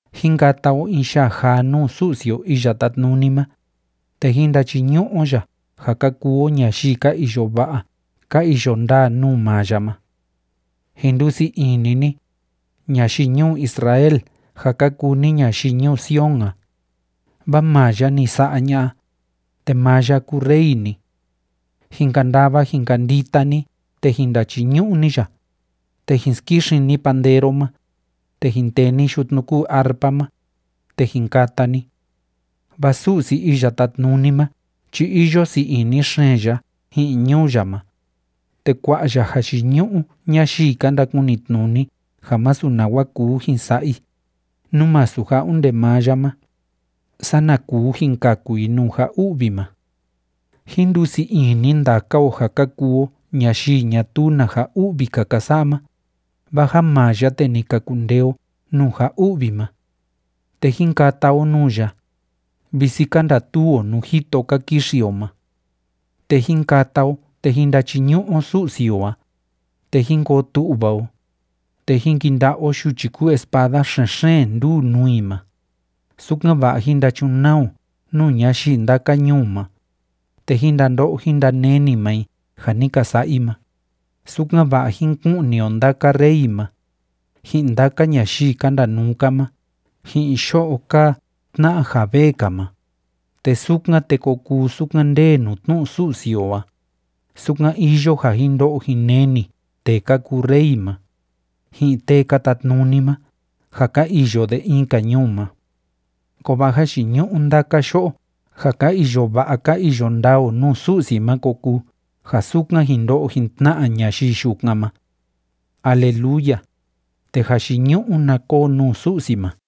Jín kata o in yaa jaa nuu Su'si o Iya Tátnuni ma, te jín ndachiñu'u o ya ja ka kuu o ñayii ka iyo va'a ka iyo ndaa nuu maa ya ma. Jin ndusii ini ni, ñayii ñuu Israel ja ka kuu ni ñayii ñuu Sion a, vaa maa ya ni sa'a ña'a, te maa ya kúu Rey ni. Jin kandava jin kandita ni, te jin ndachiñu'u ni ya, te jin skixin ni pandero ma, te jin tee ni yutnu kúu arpa ma, te jin kata ni. Vaa Su'si Iya Tátnuni ma chi iyo sii ini xeen ya ji'in ñuu ya ma, te kua'a ya jayiñu'u ñayii ka ndakunitnuni ja masu nawa kuu jin sa'a i, nú masu ja onde maa ya ma, sana kuu jin kaku i nuu ja u'vi ma. Jín ndusii ini ndaka o ja ka kuu o ñayii ñatuu na ja u'vi‑ka ka sa'a ma, vaa ja maa ya, te ni ka kundee o nuu ja u'vi ma. Te jín kata o nuu ya, visi ka ndatuu o nuu jito ka kixi o ma. Te jín kata o te jín ndachiñu'u o Su'si o a, te jín koo tu'va o, te jín kinda'a o yuchi kúu espada xen‑xeen nduu nuu i ma, sukan‑va'a jín ndachunaa o nuu ñayii ndaka ñuu ma, te jín ndando'o jín ndaneni maa i ja ni ka sa'a i ma, sukan‑va'a jín ku'ni o ndaka rey ma, ji'in ndaka ñayii ka ndanuu‑ka ma ji'in yo'o kaa tna'a ja vee‑ka ma, te sukan, te ko kuu sukan ndee nuu tnu'u Su'si o a, sukan iyo ja jin ndo'o jin neni tee ka kuu rey ma, ji'in tee ka tatnuni ma ja ka iyo de in‑ka ñuu ma. Kovaa jayiñu'u ndaka yo'o ja ka iyo va'a ka iyo ndaa o nuu Su'si ma ko kuu ja sukan jin ndo'o jin tna'a ñayii yukan ma. ¡Aleluya! ¡Te jayiñu'u na koo nuu Su'si ma!